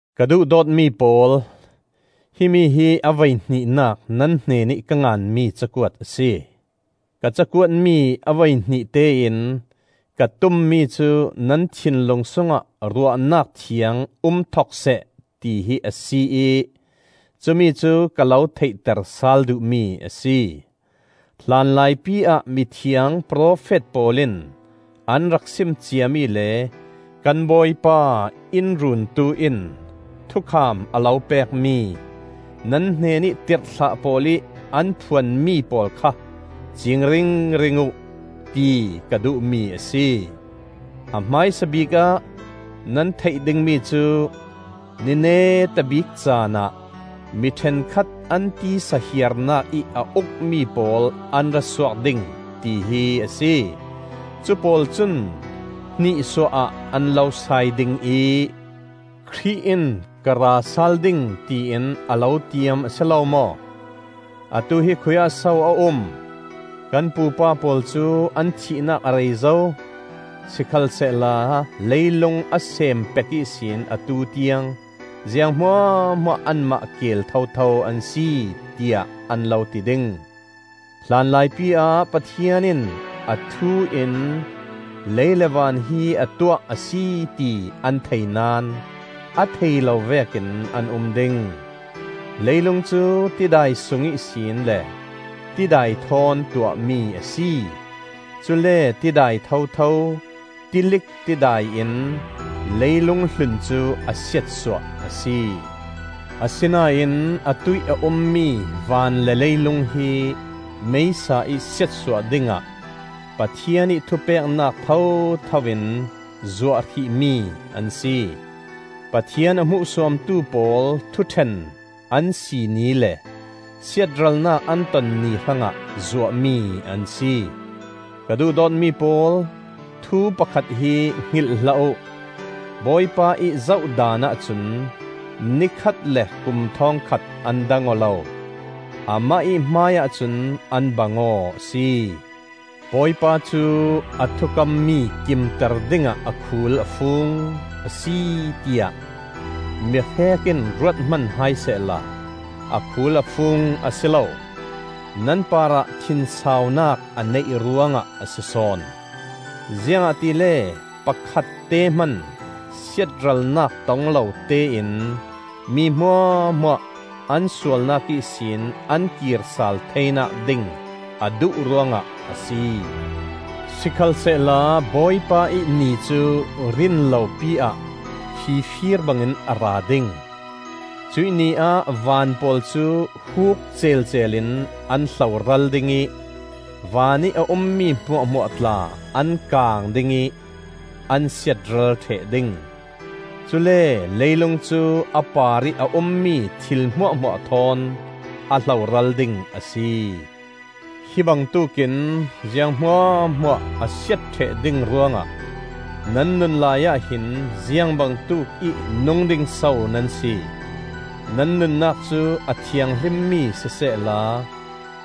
Ka duhdawtmi pawl, himi hi a voihnihnak nan hnenih ka nganmi cakuat a si. Ka cakuatmi a voihnih tein ka tummi cu nan thinlung sungah ruahnak thiang um thok seh tihi a si ih cumi cu ka lo theihter sal duhmi a si. Hlanlaipi ah mithiang profet pawl in an rak sim ciami le kan Bawipa in Runtu in thukham a lo pekmi, nan hnenih tirhthlah pawl ih an phuanmi pawl kha ciing ringring uh, ti ka duhmi a si. A hmaisabik ah nan theih dingmi cu: ni neta bik caanah mi ṭhenkhat an tisa hiarnak ih a ukmi pawl an ra suak ding, tihi a si. Cupawl cun hnihsuah ah an lo sai ding ih, “Khrih in ka ra sal ding, tiin a lo tiam a si lo maw? Atu hi khuiah so a um? Kan pupa pawl cu an thihnak a rei zo, sikhalsehla leilung a seem pek ihsin atu tiang ziang hmuahhmuah anmah keel thotho an si,” tiah an lo ti ding. Hlanlaipi ah Pathian in a thu in lei le van hi a tuah a si ti an thei naón a thei lo vekin an um ding. Leilung cu tidai sung ihsin le tidai thawn tuahmi a si. Cule tidai thotho, tilik tidai in leilung hlun cu a siatsuah a si. Asinain atuih a ummi van le leilung hi meisa-ih siatsuah dingah Pathian ih thupeknak thotho in zuah hrihmi an si. Pathian a hmuhsuamtu pawl thuṭhen an si ni le siatralnak an ton ni hrangah zuahmi an si. Ka duhdawtmi pawl, thu pakhat hi hngilh hlah uh: Bawipa ih zoh daanah cun ni khat le kum thawngkhat an dang aw lo; amah ih hmaiah cun an bang aw a si. Bawipa cu a thukammi kimter dingah a khul a fung a si tiah mihrek in ruat hman hai sehla, a khul a fung a si lo. Nan parah thinsaunak a neih ruangah a si sawn; ziangahtile pakhatte hman siatralnak tong lotein mi hmuahhmuah an sualnak ihsin an kir sal theinak ding a duh ruangah a si. Sikhalsehla Bawipa ih Ni cu rinlopi ah fifir bangin a ra ding. Cuih Ni ah van pawl cu huuk celcel in an hloral ding ih vanih a ummi hmuahhmuah tla an kaang ding ih an siatral ṭheh ding. Cule leilung cu a parih a ummi thil hmuahhmuah thawn a hloral ding a si. Hi bangtuk in ziang hmuahhmuah a siat ṭheh ding ruangah nan nun laiah hin ziang bangtuk i nung ding so nan si? Nan nunnak cu a thianghlimmi sisehla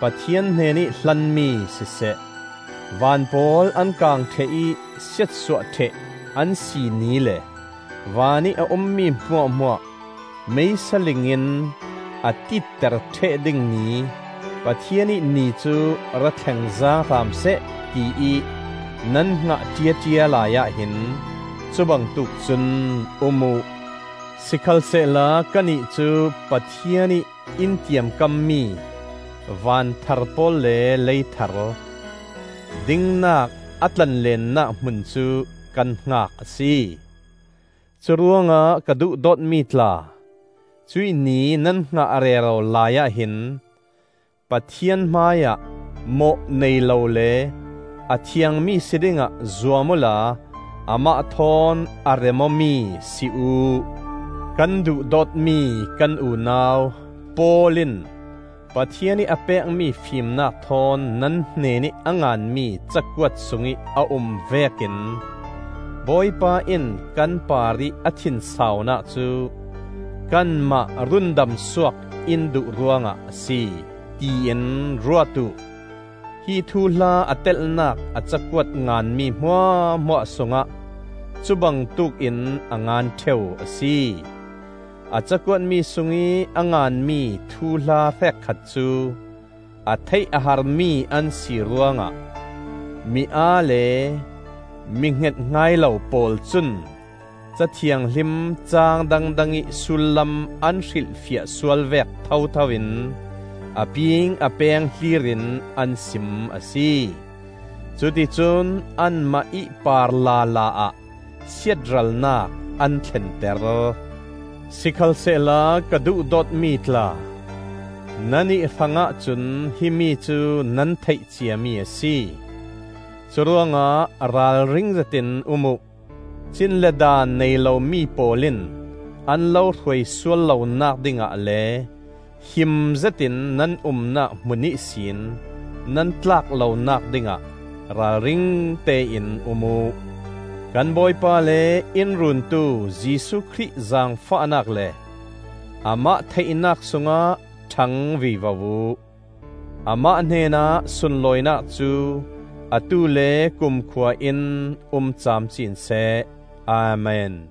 Pathian hnenih hlanmi siseh. Van pawl an kaang ṭheh ih siatsuah ṭheh an si ni le vanih a ummi hmuahhmuah meisaling in a tiitter ṭheh ding ni Pathian ih Ni cu ra thleng zaang hram seh tiih nan hngah ṭiaṭia lai ah hin cubangtuk cun um uh. Sikhalsehla kannih cu Pathian ih in tiamkammi van thar pawl le lei thar, dingnak a tlanleennak hmun cu kan hngak a si. Curuangah ka duhdawtmi tla, cuih Ni nan hngah rero laiah hin Pathian hmaiah mawh nei lo le a thiangmi si dingah zuam uhla amah thawn a rem-awmi si uh. Kan duhdawtmi kan unau Paul in Pathian ih a pekmi fimnak thawn nan hnenih a nganmi ca kuat sungih a um vekin Bawipa in kan parih a thinsaunak cu kanmah rundamsuak in duh ruangah a si, tiin ruat uh. Hi thuhla a telhnak a cakuat nganmi hmuahhmuah sungah cu bangtuk in a ngan ṭheu a si. A cakuatmi sungih a nganmi thuhla hrekkhat cu a theih a harmi an si ruangah mi aa le mi hnget hngai lo pawl cun, Ca Thianghlim caang dangdangih sullam an hrilhfiah sual vek thothoin, a ping a peng hlirin an sim a si. Cuticun anmah ih par lala ah siatralnak an thlenter. Sikhalsehla ka duhdawtmi tla, nannih hrangah cun himi cu nan theih ciami a si. Curuangah ralring zetin um uh! Cin le daan nei lomi pawl in an lo hruai sual lonak dingah le him zetin nan umnak hmun ihsin nan tlak lonak dingah ralringte in um uh. Kan Bawipa le in Runtu Jesuh Khrih zaangfahnak le amah theihnak sungah ṭhang vivo uh. Amah hnenah sunlawinak cu atu le kumkhua in um camcin seh. Amen.